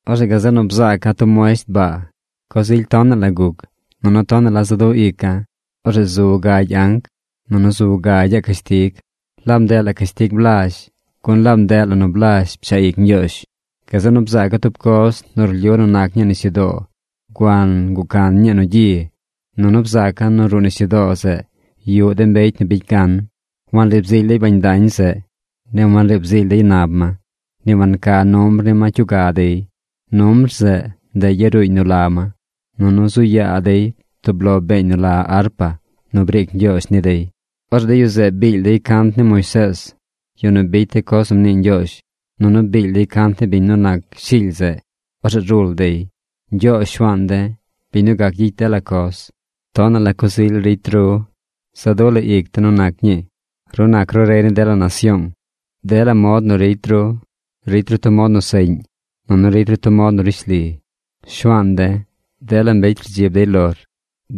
Orzeꞌ gazeꞌ nu bzaaca̱ tub muesht baa. Coz ily tonaꞌ la guc, nunu tonaꞌ la za du ica̱. Orzeꞌ zu gagy anc. Nunu zu gagyaꞌ cashtig. Laab ndeꞌ la cashtig blazh, gun laab ndeꞌ la nu blazh pchaꞌ ic Ñgyoozh. Gazeꞌ nu bzaaca̱ tub coz nu rlyu nu nac ñii nisyudoo guan guꞌ can ñii nu gyi. Nunu bzaaca̱ nu ruꞌ nisyudoo zeꞌ yuꞌ de mbecy nu bicy gan. Wanriib zily dey bañ dañ zeꞌ. Ni wanriib zily dey nab ma. Ni wanca numbr ni ma cyuga dey. Numbr zeꞌ, ndeꞌ yaruuñ nu la ma. Nunu zu yaa dey tub lo beeñ nu la arpa nu briic Ñgyoozh ni dey. Orzeꞌ de yu zeꞌ biil dey cant ni Moisees, yu nu bicy de coz nu mnii Ñgyoozh. Nunu biil dey cant ni biñ nu nac Shily zeꞌ. Orzeꞌ rul dey: Ñgyoozh Shuaan de̱, biñ nu gac gyicy dela coz, tonaꞌ la coz ily ricy through. Za du la ic de̱ nu nac ñii. Ru nac ru rey ni dela nasyoong. Dela mod nu ricy ru ricy ru tub mod nu seꞌñ, nunu ricy ru tub mod nu rishli. Shuaan de̱, dela mbecy rdzib dey lor.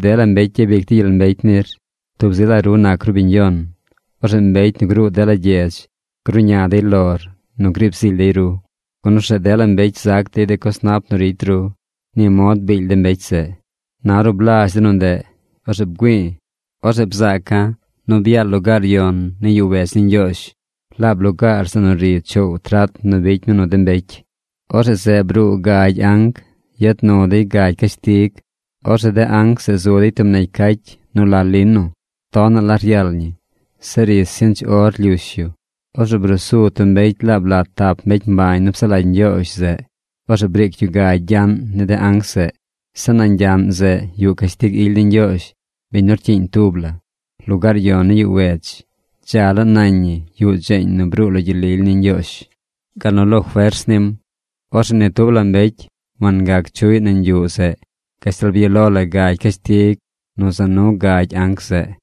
Dela mbecy gyabic dey gyel mbecy nir. Tub zi la ru nac ru biñ yon. Orzeꞌ mbecy nu gruu dela gyedz gruꞌña dey lor nu griib zily dey ru, gun orzeꞌ dela mbecy zac dey de coz nap nu ricy ru. Ni mod biil de mbecy zeꞌ. Na ornu blazh de nu ndeꞌ, orzeꞌ bgüi̱i̱. Orzeꞌ bzaaca̱ nu byaal lugaar yon ni yuꞌ wedz ni Ñgyoozh, laab lugaar zeꞌ nu ri choow trat nu bicy mi nu de mbecy. Orzeꞌ zeꞌ bruu gagy anc, yad nu dey gagy cashtig. Orzeꞌ de anc zeꞌ zu dey tub negy cacy nu la lino. Tonaꞌ la ryal ñi. Zeꞌ ri sinch or lyush yu. Orzeꞌ brusu tub mbecy laab lat tap mbecy mbañ nu psaꞌ lagy Ñgyoozh zeꞌ. Orzeꞌ briic yu gagy gyaꞌn ni de anc zeꞌ. Zeꞌ nañ gyaꞌn zeꞌ yuꞌ cashtig ily ni Ñgyoozh, biñ nu rcyiiñ tub la. Lugaar yon ni yuꞌ wedz, dza laa nañ ñi yuꞌ dzeeñ nu bruu lo gyel lily ni Ñgyoozh, gal nu lo fers nim. Orzeꞌ ni tub la mbecy wangac chuꞌy nañ yuꞌ zeꞌ gashtal byaꞌ lo la gagy cashtig nu za nu gagy anc zeꞌ.